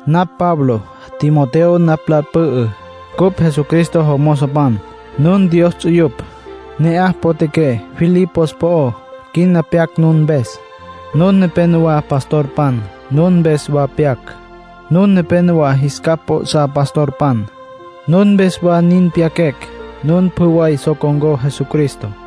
Napj Pablo. Timoteo napj lal pü'ü. Cupj Jesucristo jomozopan. Nun Dios ts'uyupj, ne'aj potjaqué Filipos po'ó. Quina pyaquecj nun mpes. Nun nepénowa pastorpan. Nun mpes wa pyaquecj. Nun nepénowa jis capj p'o'sá pastorpan. Nun mpes wa nin pyaquecj. Nun pjü way so con̈có Jesucristo.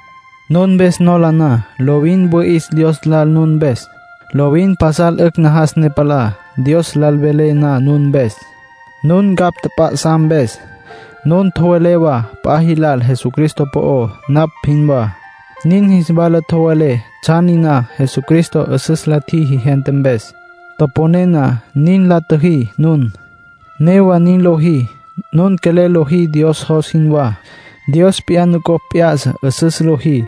Nun mpes nola na, lovin wüi'is Dios lal nun mpes. Lovin pasal 'ücj najas ne palá, Dios lal velé na nun mpes, nun ncapj tjap'a'sá mpes. Nun tjowelé wa p'a jilal Jesucristo po'ó napj jinwá. Nin jis wala tjowelé tsjan niná Jesucristo 'üsüs la tjiji gente mpes. Toponé na nin la tjüjí nun. Newa nin lojí. Nun quelel lojí Dios jos jinwá. Dios p'iyá nucopj p'ya'sa 'üsüs lojí.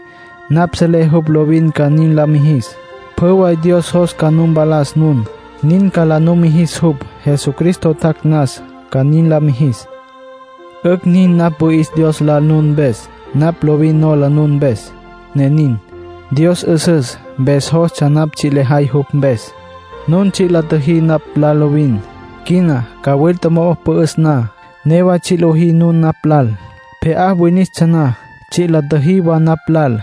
Napj selé jupj lovin ca nin la mijis. Pjü way Dios jos ca nu mpalas nun, nin ca la numijis jupj. Jesucristo tjac' nas ca nin la mijis. 'Ücj nin napj wüi'is Dios lal nun mpes; napj lovin nola nun mpes, ne nin. Dios 'üsüs, mpes jostsja napj tsji' lejay jupj mpes. Nun tsji' la tjüjí napj lal lovin. Quina, cawilta mo'o pü'üs na, newa tsji' lojí nun napj lal. Pje'á winistsja na, tsji' la tjüjí wa napj lal.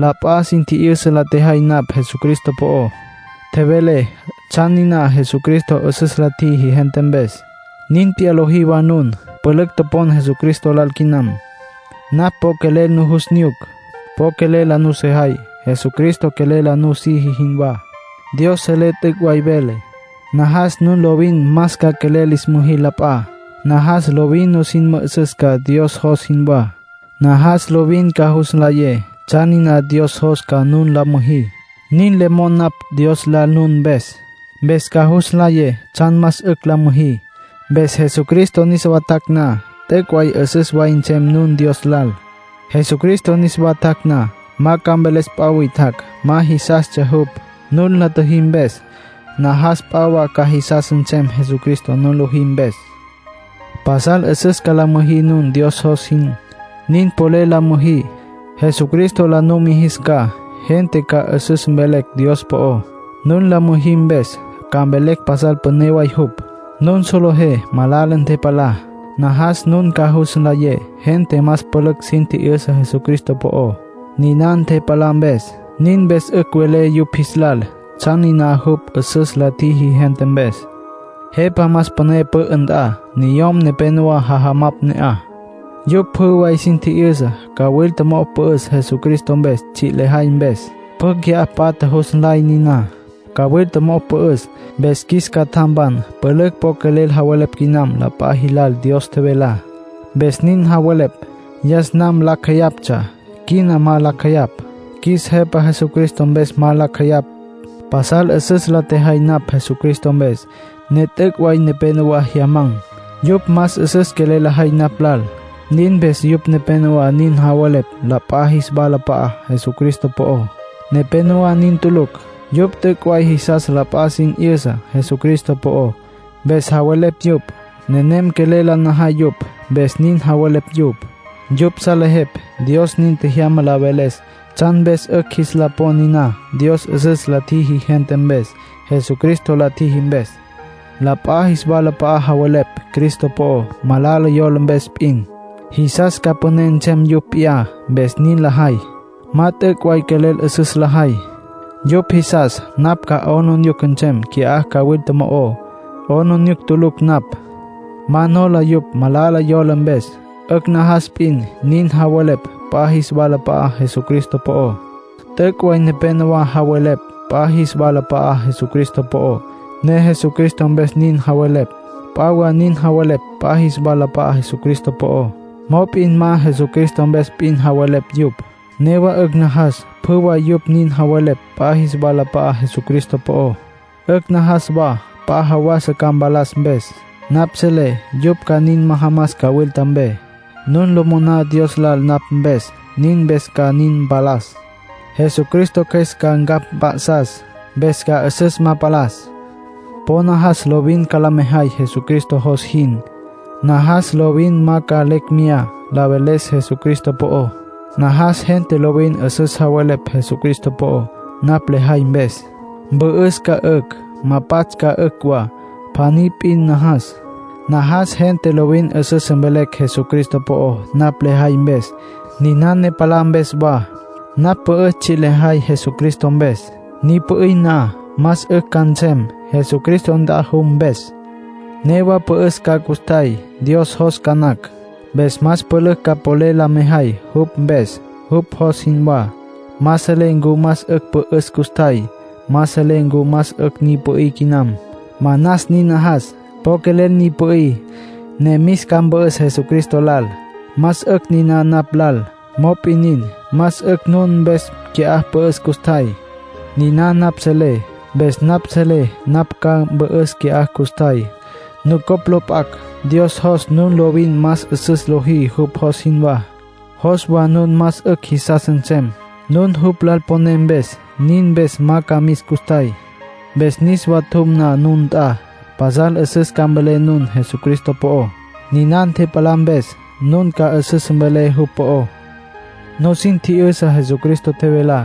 La p'a sin tji'yüsa la tjejay napj Jesucristo po'ó. Tjevelé tsjan niná Jesucristo 'üsüs la tjiji gente mpes. Nin p'iyá lojí wa nun. Pülücj topon Jesucristo lal quinam. Napj po quelel nujus nyuc. Po quelel la nusejay, Jesucristo quelel la nusiji jinwá. Dios selé t'üc' way velé. Najas nun lovin más ca quelel lis müjí la p'a. Najas lovin nusin mü'üsüs ca Dios jos jinwá. Najas lovin ca jus nlayé tsjan niná Dios jos ca nun la müjí. Nin le mon napj Dios lal nun mpes. Mpes ca jus nlayé tsjan más 'ücj la müjí. Mpes Jesucristo niswa tjac' na, t'üc' way 'üsüs way nsem nun Dios lal. Jesucristo niswa tjac' na, ma ca mveles p'a witjacj ma jisastsja jupj, nun la tjüjí mpes. Najas p'a wa ca jisas nsem Jesucristo nun lojí mpes. Pasal 'üsüs ca la müjí nun, Dios jos jin. Nin polel la müjí, Jesucristo la numijis ca. Gente ca 'üsüs mvelecj Dios po'ó, nun la müjí mpes. Ca mvelecj pasal püné way jupj. Nun solejé malala ntepalá. Najas nun ca jus nlayé gente más pülücj sin tji'yüsa Jesucristo po'ó, niná ntepalá mpes. Nin mpes 'ücj velé yupj jis lal tsjan niná jupj 'üsüs la tjiji gente mpes. Jepa más püné pü'ü nt'a, niyom nepénowa jajamapj ne'aj. Yupj pjü way sin tji'yüsa cawilta mo'o pü'üs Jesucristo mpes tsji' lejay mpes. Pjü qui'á patja jus nlay niná. Cawilta mo'o pü'üs, mpes qjuis catjampan pülücj po quelel javelepj quinam p'a jilal Dios tjevelá. Mpes nin javelepj. Yas nam lacj jeyaptsja, quina ma lacj jeyapj. Qjuis Jepa Jesucristo mpes ma lacj jeyapj. Pasal 'üsüs la tjejay napj Jesucristo mpes, ne t'üc' way nepénowa jyaman̈. Yupj más 'üsüs quelel lajay napj lal. Nin mpes yupj nepénowa nin javelepj la p'a jis walap'a'á Jesucristo po'ó. Nepénowa nin tulucj. Yupj t'üc' way jisas la p'a sin 'yüsa Jesucristo po'ó, mpes javelepj yupj. Nenem quelel la najay yupj, mpes nin javelepj yupj. Yupj salejepj Dios nin tjejyama la veles tsjan mpes 'ücj jis la pon niná Dios 'üsüs la tjiji gente mpes Jesucristo la tjiji mpes. La p'a jis walap'a'a javelepj Cristo po'ó malala yola mpes p'in. Jisas ca püné nsem yupj p'iyá, mpes nin lajay. Ma t'üc' way quelel 'üsüs lajay. Yupj jisas napj ca 'aplijila nsem qui'á cawilta mo'ó. 'Aplijila tulucj napj. Ma nola yupj malala yola mpes. 'Ücj najas p'in nin javelepj p'a jis walap'a'á Jesucristo po'ó. T'üc' way nepénowa javelepj p'a jis walap'a'á Jesucristo po'ó, ne Jesucristo mpes nin javelepj. P'a wa nin javelepj p'a jis walap'a'á Jesucristo po'ó, mop'in ma Jesucristo mpes p'in javelepj yupj. Newa 'ücj najas pjü way yupj nin javelepj p'a jis walap'a'á Jesucristo po'ó. 'Ücj najas wa p'a jawasa ca mpalas mpes. Napj selé yupj ca nin majamas cawilta mpe. Nun lo moná Dios lal napj mpes; nin mpes ca nin mpalas. Jesucristo Cjües ca ncapj mp'a'sas, mpes ca 'üsüs ma palas. Po najas lovin ca la mejay Jesucristo jos jin. Najas lovin ma ca lecj meyá la veles Jesucristo po'ó. Najas gente lovin 'üsüs javelepj Jesucristo po'ó, napj lejay mpes. Mpü'üs ca, 'ücj. Ma pats' ca, 'ücj wa. Pjaní p'in najas: najas gente lovin 'üsüs mvelecj Jesucristo po'ó napj lejay mpes, niná ne palá mpes wa. Napj pü'üs tsji' lejay Jesucristo mpes. Ni pü'í na, más 'ücj ca nsem, Jesucristo nt'a jum mpes. Newa mpü'üs ca custjay, Dios jos ca nacj. Mpes más pülücj ca polel la mejay jupj mpes, jupj jos jinwá. Ma selé ncu más 'ücj pü'üs custjay. Ma selé ncu más 'ücj ni pü'í quinam. Manas nin najas. Po quelel ni pü'í, ne mis ca, mpü'üs Jesucristo lal. Más 'ücj niná napj lal. Mop'in nin, más 'ücj nun mpes qui'á pü'üs custjay. Niná napj selé. Mpes napj selé napj ca mpü'üs qui'á custjay, nucopj lo p'acj; Dios jos nun lovin más 'üsüs lojí jupj jos jinwá. Jos wa nun más 'ücj jisas nsem, nun jupj lal poné mpes. Nin mpes ma ca mis custjay. Mpes niswa tjum na nun nt'a, pasal 'üsüs ca mvelé nun Jesucristo po'ó. Niná ntepalá mpes, nun ca 'üsüs mvelé jupj po'ó. Nusin tji'yüsa Jesucristo tjevelá.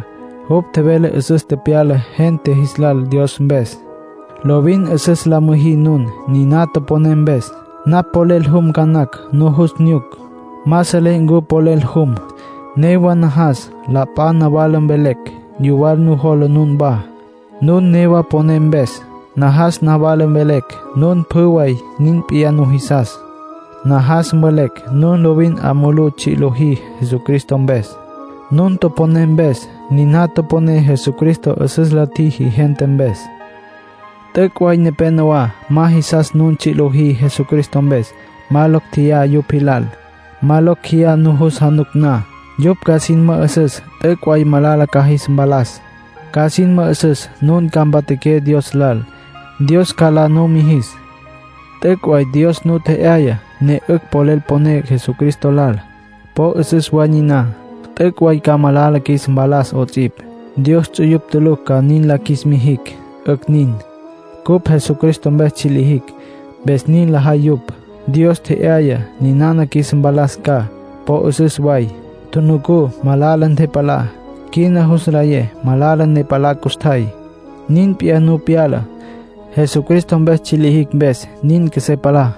Jupj tjevele 'üsüs tepyala gente jis lal Dios mpes. Lovin 'üsüs la müjí nun, niná toponé mpes. Napj polel jum ca nacj nujus nyuc. Ma selé ncu polel jum. Newa najas la p'a nawala mvelecj yuwal nujola nunwá, nun newa poné mpes. Najas nawala mvelecj nun pjü way nin p'iyá nujisas. Najas mvelecj nun lovin 'a mulú tsji' lojí Jesucristo mpes, nun toponé mpes, niná toponé Jesucristo 'üsüs la tjiji gente mpes. T'üc' way nepénowa ma jisas nun tsji' lojí Jesucristo mpes. Ma locj tjeyá yupj jilal. Ma locj jeyá nujus januc na, yupj ca sin mü'üsüs t'üc' way malala ca jis mpalas. Ca sin mü'üsüs nun ca mpatjaqué Dios lal, Dios ca la numijis. T'üc' way Dios nu tje'yaya ne 'ücj polel poné Jesucristo lal. Po 'üsüs way niná. T'üc' way ca malala qjuis mpalas 'ots'ipj, Dios ts'uyupj tulucj ca nin la qjuis mijicj. 'Ücj nin. Cupj Jesucristo mpes tsji' lijicj, mpes nin lajay yupj. Mpes po 'üsüs. Dios tje'yaya ninana qjuis mpalas ca. Po 'üsüs way. Tjunucú malala ntepalá. Quina jus nlayé malala ne palá custjay. Nin p'iyá nu pyala. Jesucristo mpes tsji' lijicj mpes nin qjuesé palá.